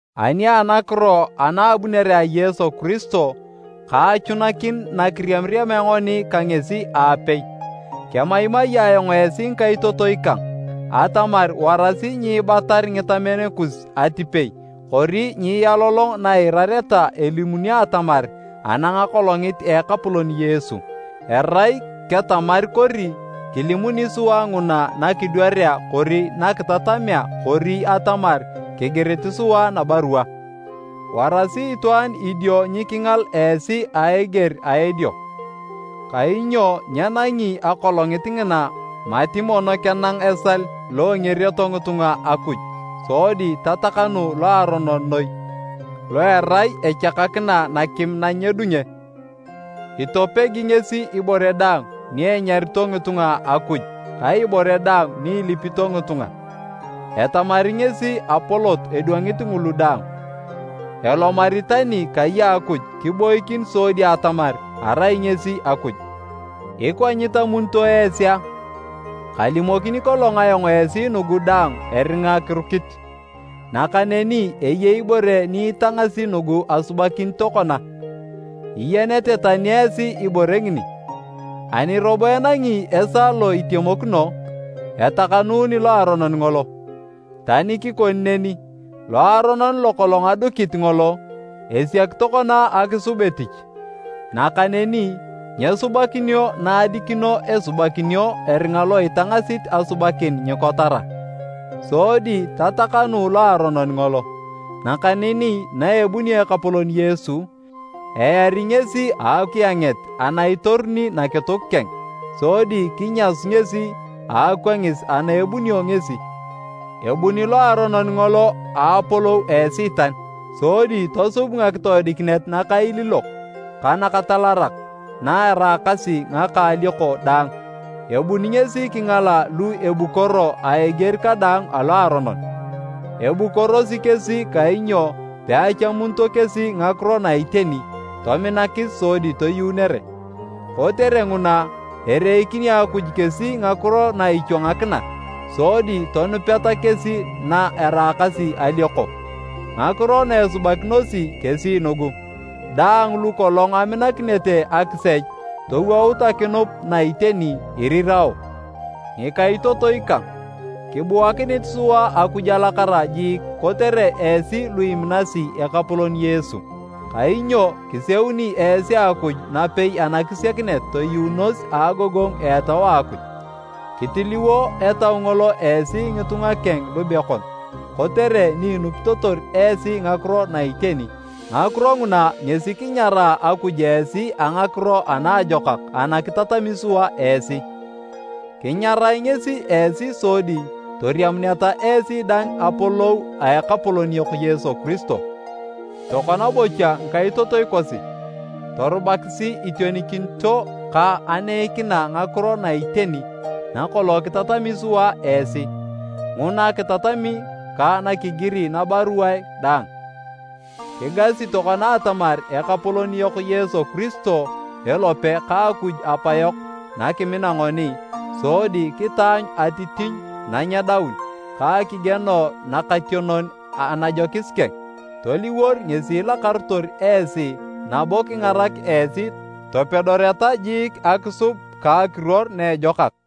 Ani anakiro ana a abunere a Yesu Kiristo ka achunakin nakiriamiriamea ngoni ka ngesi aapei. Kemaimai ayong esi ngikaitotoi kang, atamar warasi nyiibatar ngitamen kus atipei kori nyiialolong na iirareta elimunio atamar anang Akolongit a Ekapolon Yesu. Erai ketamar kori kilimuni sua nguna nakidwarea kori nakitatamea kori atamar kigirit sua nabarua. Warasi itwaan idio nyikingal esi a eger a edio. Kainyo nyenangi Akolongit ngina mati mono kenang esal lo engerioto ngitunga Akuj sodi tatakanu Loaronon noi lo erai echakakina nakim nanyedunge. Itopegi ngesi ibore daang ni enyarito ngitunga akuj ka ibore daang ni ilipito ngitunga. Etamari ngesi apolot edwangit ngulu daang. Elomari tani kai a Akuj kiboikin sodi atamar arai ngesi Akuj. Ikwa nyitamunito esi a? Kalimokini kolong ayong esi nugu daang eringa kirukit. Nakaneni eyei ibore ni itangasi nugu asubakin tokona, iyenete tani esi ibore ngini. Ani robo enangi esaa lo itemokino, etakanuni Loaronon ngolo. Tani kikoni neni, loaronon lokolong adukit ngolo, esiak tokona akisub etich, nakaneni nyesubakinio na edikino esubakinio eringa lo itangasit asubakin nyikotara. Sodi tatakanu Loaronon ngolo, nakaneni na ebunio Ekapolon Yesu, eari ngesi a akienget ana itoruni nakituk keng sodi kinyasu ngesi a akwangis ana ebunio ngesi. Ebuni Loaronon Ngolo a apolou a Esiitan sodi tosub ngakitoodikinet nakailiilok ka nakatalarak na eraakasi ngaka alioko daang, ebuni ngesi kingala lu ebukoro a eger kadaang alo aronon. Ebukorosi kesi kainyo peachamunito kesi ngakiro na iteni tominakis sodi toyuunere. Kotere nguna, ereikini Akuj kesi ngakiro na ichwangakina sodi tonupeta kesi na eraakasi alioko. Ngakiro na esubakinosi kesi nugu, daang lu kolong aminakinete akisech towout akinup na iteni, irirao. Ngikaitotoi kang, kibuakinit sua Akuj alakara jiik kotere esi lu iminasi Ekapolon Yesu. Kainyo kiseuni esi Akuj napei anakisiakinet toyuunos a agogongu a Etau a Akuj. Kitiliwo Etau ngolo esi ngitunga keng lubekon kotere ni inupitotor esi ngakiro na iteni. Ngakiro nguna ngesi kinyaraa Akuj esi a Ngakiro a Naajokak ana kitatami sua esi. Kinyarae ngesi esi sodi toriamuneta esi dang apolou a Ekapolon yok Yesu Kiristo. Tokona bocha ngikaitotoi kosi, torubakisi itionikinito ka aneikina ngakiro na iteni na kolong kitatami sua esi, nguna kitatami ka nakigiri nabaruae dang. Kigasi tokona atamar Ekapolon yok Yesu Kiristo elope ka Akuj Apayok na kimina ngoni, sodi kitaanyu atitinyu nanyedaun ka akigieno nakationon anajokis keng, toliwor ngesi ilakarotor esi nabo kingarak esi topedoreta jiik akisub ka akiruor na ejokak.